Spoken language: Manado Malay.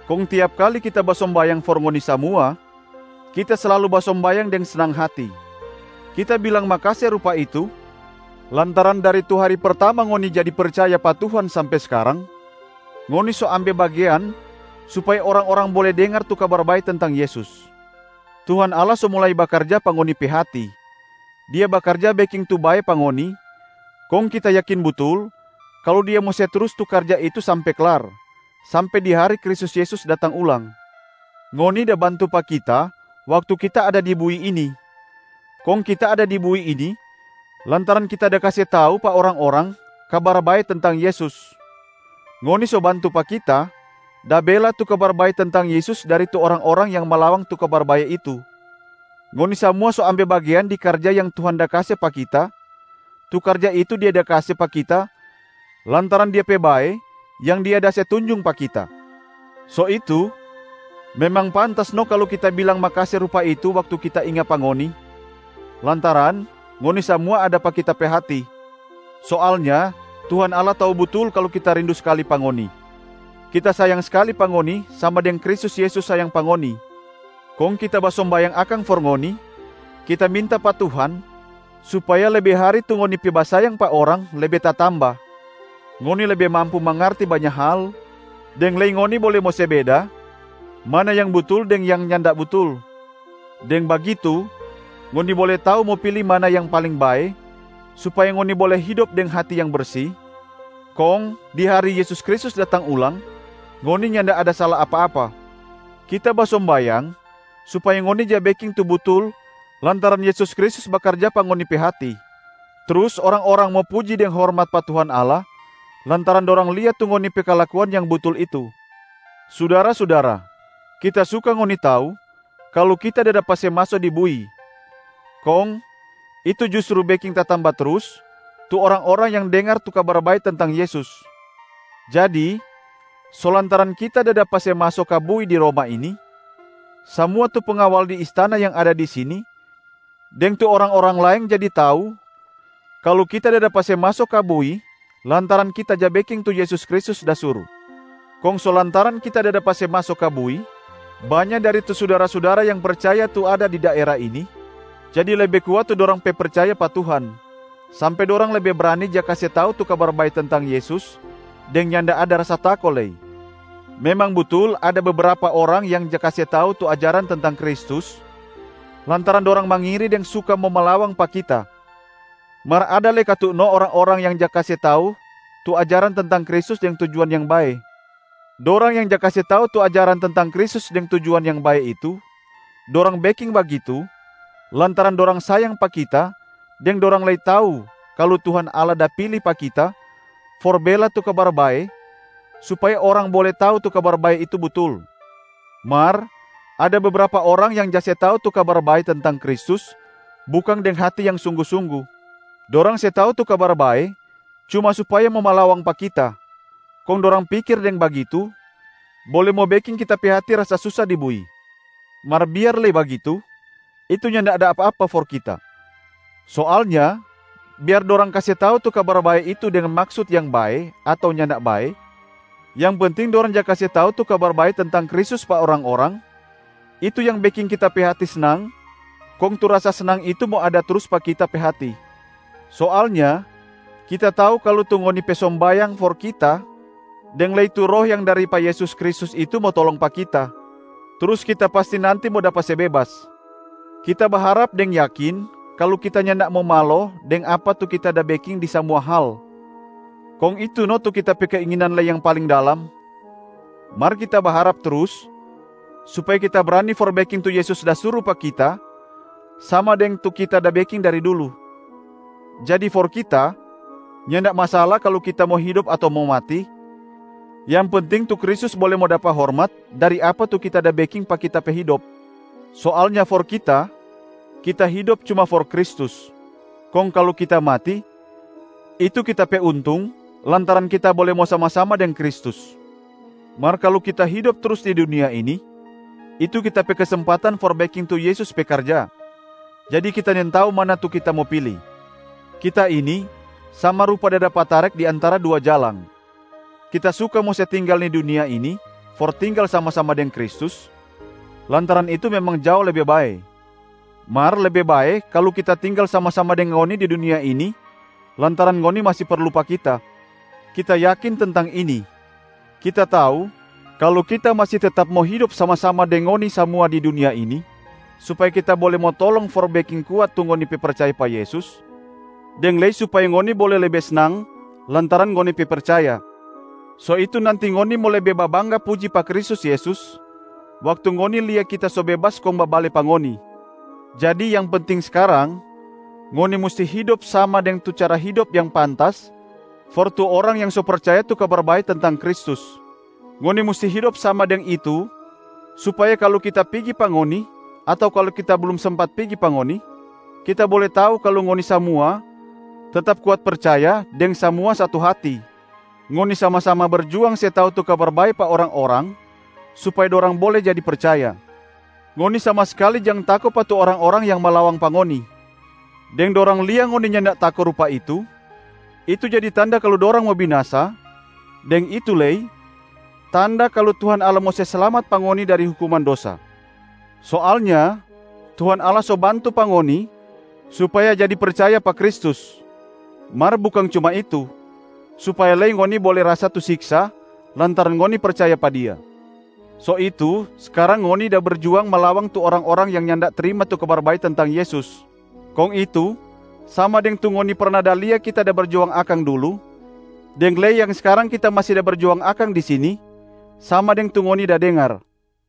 Kong tiap kali kita basombayang for ngoni samua, kita slalu basombayang deng snang hati. Kita bilang makase rupa itu lantaran dari tu hari pertama ngoni jadi percaya pa Tuhan sampe skarang, ngoni so ambe bagean supaya orang-orang bole dengar tu Kabar Bae tentang Yesus. Tuhan Allah so mulai bakarja pa ngoni pe hati, Dia bakarja beking tu bae pa ngoni, kong kita yakin butul kalu Dia mo se trus tu karja itu sampe klar, sampe di hari Kristus Yesus datang ulang. Ngoni da bantu pa kita waktu kita ada di bui ini, kong kita ada di bui ini lantaran kita da kase tau pa orang-orang Kabar Bae tentang Yesus. Ngoni so bantu pa kita da bela tu Kabar Bae tentang Yesus dari tu orang-orang yang malawang tu Kabar Bae itu. Ngoni samua so ambe bagean di karja yang Tuhan da kase pa kita, tu karja itu Dia da kase pa kita lantaran Dia pe bae yang Dia da se tunjung pa kita. So itu memang pantas no kalu kita bilang makase rupa itu waktu kita inga pa ngoni, lantaran ngoni samua ada pa kita pe hati. Soalnya Tuhan Allah tau butul kalu kita rindu skali pa ngoni. Kita sayang skali pa ngoni sama deng Kristus Yesus sayang pa ngoni. Kong kita basombayang akang for ngoni, kita minta pa Tuhan supaya lebe hari tu ngoni pe basayang pa orang lebe tatamba, ngoni lebe mampu mangarti banya hal, deng lei ngoni bole mo se beda mana yang butul deng yang nyanda butul. Deng bagitu ngoni bole tau mo pili mana yang paling bae supaya ngoni bole hidop deng hati yang bersi, kong di hari Yesus Kristus datang ulang, ngoni nyanda ada sala apa-apa. Kita basombayang supaya ngoni ja beking tu butul lantaran Yesus Kristus bakarja pa ngoni pe hati, trus orang-orang mo puji deng hormat pa Tuhan Allah lantaran dorang lia tu ngoni pe kalakuan yang butul itu. Sudara-sudara, kita suka ngoni tau kalu kita da dapa se maso di bui, kong itu justru beking tatamba trus tu orang-orang yang dengar tu Kabar Bae tentang Yesus. Jadi so lantaran kita da dapa se maso ka bui di Roma ini, samua tu pengawal di istana yang ada di sini deng tu orang-orang laeng jadi tau kalu kita da dapa se maso ka bui lantaran kita ja beking tu Yesus Kristus da suru. Kong so lantaran kita da dapa se maso ka bui, banya dari tu sudara-sudara yang percaya tu ada di daera ini jadi lebe kuat tu dorang pe percaya pa Tuhan, sampe dorang lebe brani ja kase tau tu Kabar Bae tentang Yesus deng nyanda ada rasa tako lei. Memang butul ada bebrapa orang yang ja kase tau tu ajaran tentang Kristus lantaran dorang mangiri deng suka mo malawang pa kita. Mar ada lei katu no orang-orang yang ja kase tau tu ajaran tentang Kristus deng tujuan yang bae. Dorang yang ja kase tau tu ajaran tentang Kristus deng tujuan yang bae itu, dorang beking bagitu lantaran dorang sayang pa kita deng dorang lei tau kalu Tuhan Allah da pili pa kita for bela tu Kabar Bae supaya orang bole tau tu Kabar Bae itu butul. Mar ada bebrapa orang yang ja se tau tu Kabar Bae tentang Kristus bukang deng hati yang sunggu-sunggu. Dorang se tau tu Kabar Bae cuma supaya mo malawang pa kita, kong dorang pikir deng bagitu bole mo beking kita pe hati rasa susa di bui. Mar biar lei bagitu, itu nyanda apa-apa for kita. Soalnya biar dorang kase tau tu Kabar Bae itu deng maksut yang bae ato nyanda bae, yang penting dorang ja kase tau tu Kabar Bae tentang Kristus pa orang-orang, itu yang beking kita pe hati snang kong tu rasa snang itu mo ada trus pa kita pe hati. Soalnya kita tau kalu tu ngoni pe sombayang for kita deng lei tu Roh yang dari pa Yesus Kristus itu mo tolong pa kita, trus kita pasti nanti mo dapa se bebas.a Kita baharap deng yakin kalu kita nyanda mo malo deng apa tu kita da beking di samua hal, kong itu no tu kita pe keinginan lei yang paling dalam. Mar kita baharap trus supaya kita brani for beking tu Yesus da suru pa kita sama deng tu kita da beking dari dulu. Jadi for kita, nyanda masala kalu kita mo hidop ato mo mati, yang penting tu Kristus bole mo dapa hormat dari apa tu kita da beking pa kita pe hidop. Soalnya for kita, kita hidop cuma for Kristus, kong kalu kita mati, itu kita pe untung lantaran kita bole mo sama-sama deng Kristus. Mar kalu kita hidop trus di dunia ini, itu kita pe kesempatan for beking tu Yesus pe karja. Jadi kita nintau mana tu kita mo pili. Kita ini sama rupa da dapa tarek di antara dua jalang. Kita suka mo se tinggal ni dunia ini for tinggal sama-sama deng Kristus, lantaran itu memang jao lebe bae. Mar lebe bae kalu kita tinggal sama-sama deng ngoni di dunia ini lantaran ngoni masi perlu pa kita. Kita yakin tentang ini, kita tau kalu kita masi tetap mo hidop sama-sama deng ngoni samua di dunia ini supaya kita bole mo tolong for beking kuat tu ngoni pe percaya pa Yesus, deng lei supaya ngoni bole lebe snang lantaran ngoni pe percaya. So itu nanti ngoni mo lebe babangga puji pa Kristus Yesus waktu ngoni lia kita so bebas kong babale pa ngoni. Jadi yang penting skarang, ngoni musti hidop sama deng tu cara hidop yang pantas for tu orang yang so percaya tu Kabar Bae tentang Kristus. Ngoni musti hidop sama deng itu supaya kalu kita pigi pa ngoni ato kalu kita blum sempat pigi pa ngoni, kita bole tau kalu ngoni samua tetap kuat percaya deng samua satu hati, ngoni sama-sama berjuang se tau tu Kabar Bae pa orang-orang supaya dorang bole jadi percaya. Ngoni sama skali jang tako pa tu orang-orang yang malawang pa ngoni. Deng dorang lia ngoni nyanda tako rupa itu, itu jadi tanda kalu dorang mo binasa, deng itu lei tanda kalu Tuhan Allah mo se slamat pa ngoni dari hukuman dosa. Soalnya Tuhan Allah so bantu pa ngoni supaya jadi percaya pa Kristus, mar bukang cuma itu, supaya lei ngoni bole rasa tu siksa lantaran ngoni percaya pa Dia. So itu skarang ngoni da berjuang malawang tu orang-orang yang nyanda trima tu Kabar Bae tentang Yesus, kong itu sama deng tu ngoni perna da lia kita da berjuang akang dulu deng lei yang skarang kita masi da berjuang akang di sini sama deng tu ngoni da dengar.